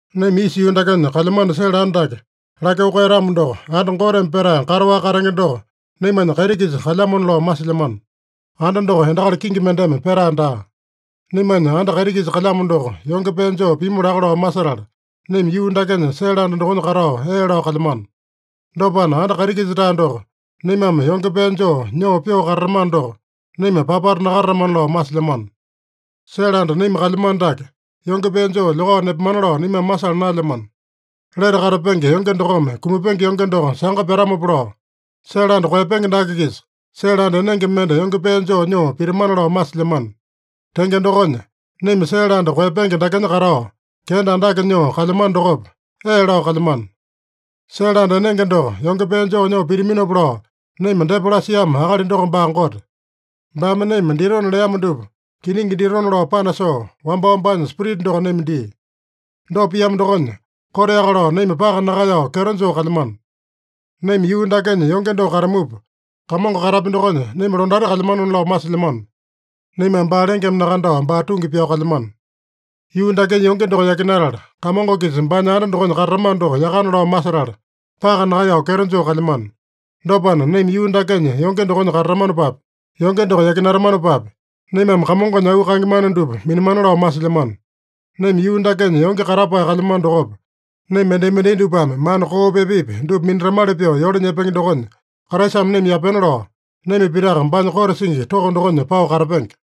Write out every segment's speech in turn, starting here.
Naima isa yuu dakenya kalyamano sele anda dake lakyoo koeyatamo doko, anda Goteme petae kataowaka katenge doko naimanya kaiti-kisa kalyamona lao masilyamano. Anda doko endakali kingi mendeme petae daa. Naimanya anda kaiti-kisa kalyamo doko yonge pee joo pimu laka lao masetala, naima yuu dakenya sele anda dokonya katao ee lao kalyamano. Dopana, anda kaiti-kisa-tae doko naimame yonge pee joo nyoo pyoo katatamano doko, naima papata nakatatamana lao masilyamano. Sele anda naima kalyamano dake yonge pee joo lyokao nepamana lao naimame masala naelyamano. Lete katapenge yonge dokome kumapenge yonge doko sanga pyatamopa lao, sele anda koeyapenge dake-kisa sele anda enenge mende yonge pee joo nyoo pitamana lao masilyamano. Tenge dokonya, naima sele anda koeyapenge dakenya katao kenda andake nyoo kalyamano dokopa, ee lao kalyamano. Sele anda enenge doko yonge pee joo nyoo pitaminopa lao naima depa lasiamo akali doko baa Gote. Baame naima ditona leamo dupa kiningi ditona lao panasoo, wambao baanya Spirita doko naima dia. Dopa piamo dokonya, koteaka lao naima paka nakaeyao kyeto joo kalyamano. Naima yuu dakenya yonge doko katamupa, Kamongo katapya dokonya naima londati kalyamanona lao masilyamano. (Naimame baa lengeme nakandao, baa tungi pyao kalyamano.) Yuu dakenya yonge doko yakinatala, Kamongo-kisa baanya anda dokonya katatamano doko yakana lao masetala, paka nakaeyao kyeto joo kalyamano. Dopana, naima yuu dakenya yonge dokonya katatamanopapi, yonge doko yakinatamanopapi, naimame Kamongonya auu kaenge mana dupa minamana lao masilyamano. Naima yuu dakenya yonge katapae kalyamano dokopa, naima mendai-mendai dupame mana koopi epepi dupa minatamali pyoo yole nyepenge dokonya Kraisame naima yapena lao, naima pitaka baanya kote singi toko dokonya pao katapenge.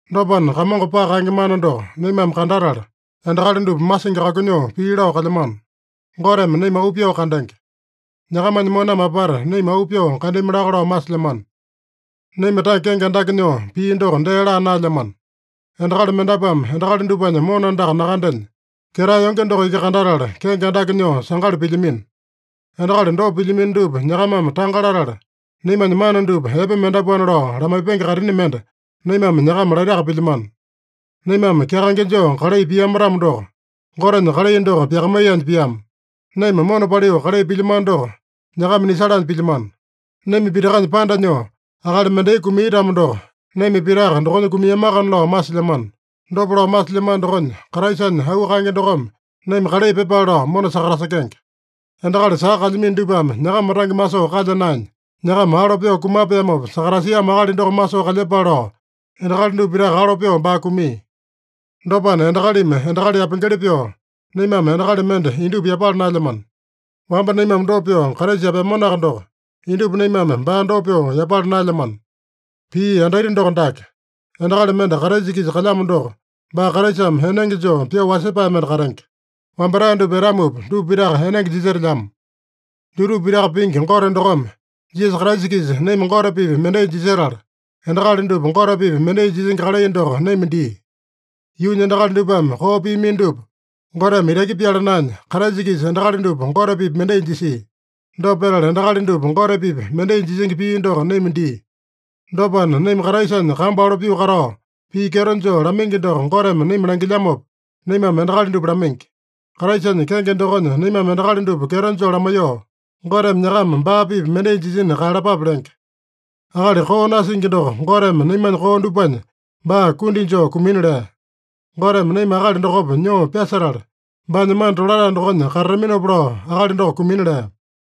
Dopana, Kamongo paka kaenge mana doko naimame kandatala, endakali dupa masingi kakunyoo pii lao kalyamano. Goteme naima auu pyoo kandenge. Nyakamanya moname apata naima auu pyoo kandami laka lao masilyamano. Naima tange kenge andake nyoo, pii doko dee laa naelyamano. Endakali mendapuame endakali dupanya mona andaka nakandenya, ketae yonge doko iki kandatala kenge andake nyoo sangali pilyamino. Endakali dopa pilyamino dupa nyakamame tanga latala, naimanya mana dupa epe mendapuana lao lamaipenge kaitini mende naimame nyakama laitaka pilyamano. Naimame kyakaenge joo kalai piama-tamo doko, Gotenya kalai doko pyakamaiyanya piama. Naima mona paliu kalai pilyamano doko, nyakama nisalanya pilyamano. Naima pitakanya panda nyoo akali mendai kumia-tamo doko, naima pitaka dokonya kumiamakana lao masilyamano. Dopa lao masilyamano dokonya, Kraisanya auu kaenge dokome naima kalai pyepale lao mona sakatasekenge. Endakali saka kalyamino dupame nyakama tange masoo kalya naenya, nyakama alo pyoo kumapeamopa sakatasiamo akali doko masoo kalyepale lao, endakali dupa pitaka alo pyoo baa kumia. Dopana endakalimi endakali yapengeli pyoo, naimame endakali mende indupa yapala naelyamano. Wamba naimame dopa pyoo Kraisa yapeamanoaka doko, indupa naimame baa dopa pyoo yapala naelyamano. Pii yandaita doko dake: Endakali mende Kraisa-kisa kalyamo doko, baa Kraisame enenge joo pyoo wasepae mende katenge. Wambatae dupa etamupa, dupa pitaka enenge jisetelyamo. Dutupa pitaka pingi Gote dokome Jisasa Kraisa-kisa naima Gote-pipa mendai jisetala, endakali dupa Gote-pipa mendai jisingi kalai doko naima dia. Yuunya endakali dupame koo piamino dupa Goteme itaki pyala naenya, Kraisa-kisa endakali dupa Gote-pipa mendai jisia. Dopa petala, endakali dupa Gote-pipa mendai jisingi pii doko naima dia. Dopana, naima Kraisanya kambu alo pyoo katao, pii kyeto joo lamaingi doko Goteme naima langilyamopa, naimame endakali dupa lamaingi. Kraisanya kenge dokonya naimame endakali dupa kyeto joo lamaiyoo, “Goteme nyakama baa-pipa mendai jisina kaeyalapape” lenge. Akali koo nasingi doko Goteme naimanya koo dupanya baa kundi joo kumina lea. Goteme naima akali dokopa nyoo pyasetala, baanya mana tolatae dokonya katataminopa lao akali doko kumina lea.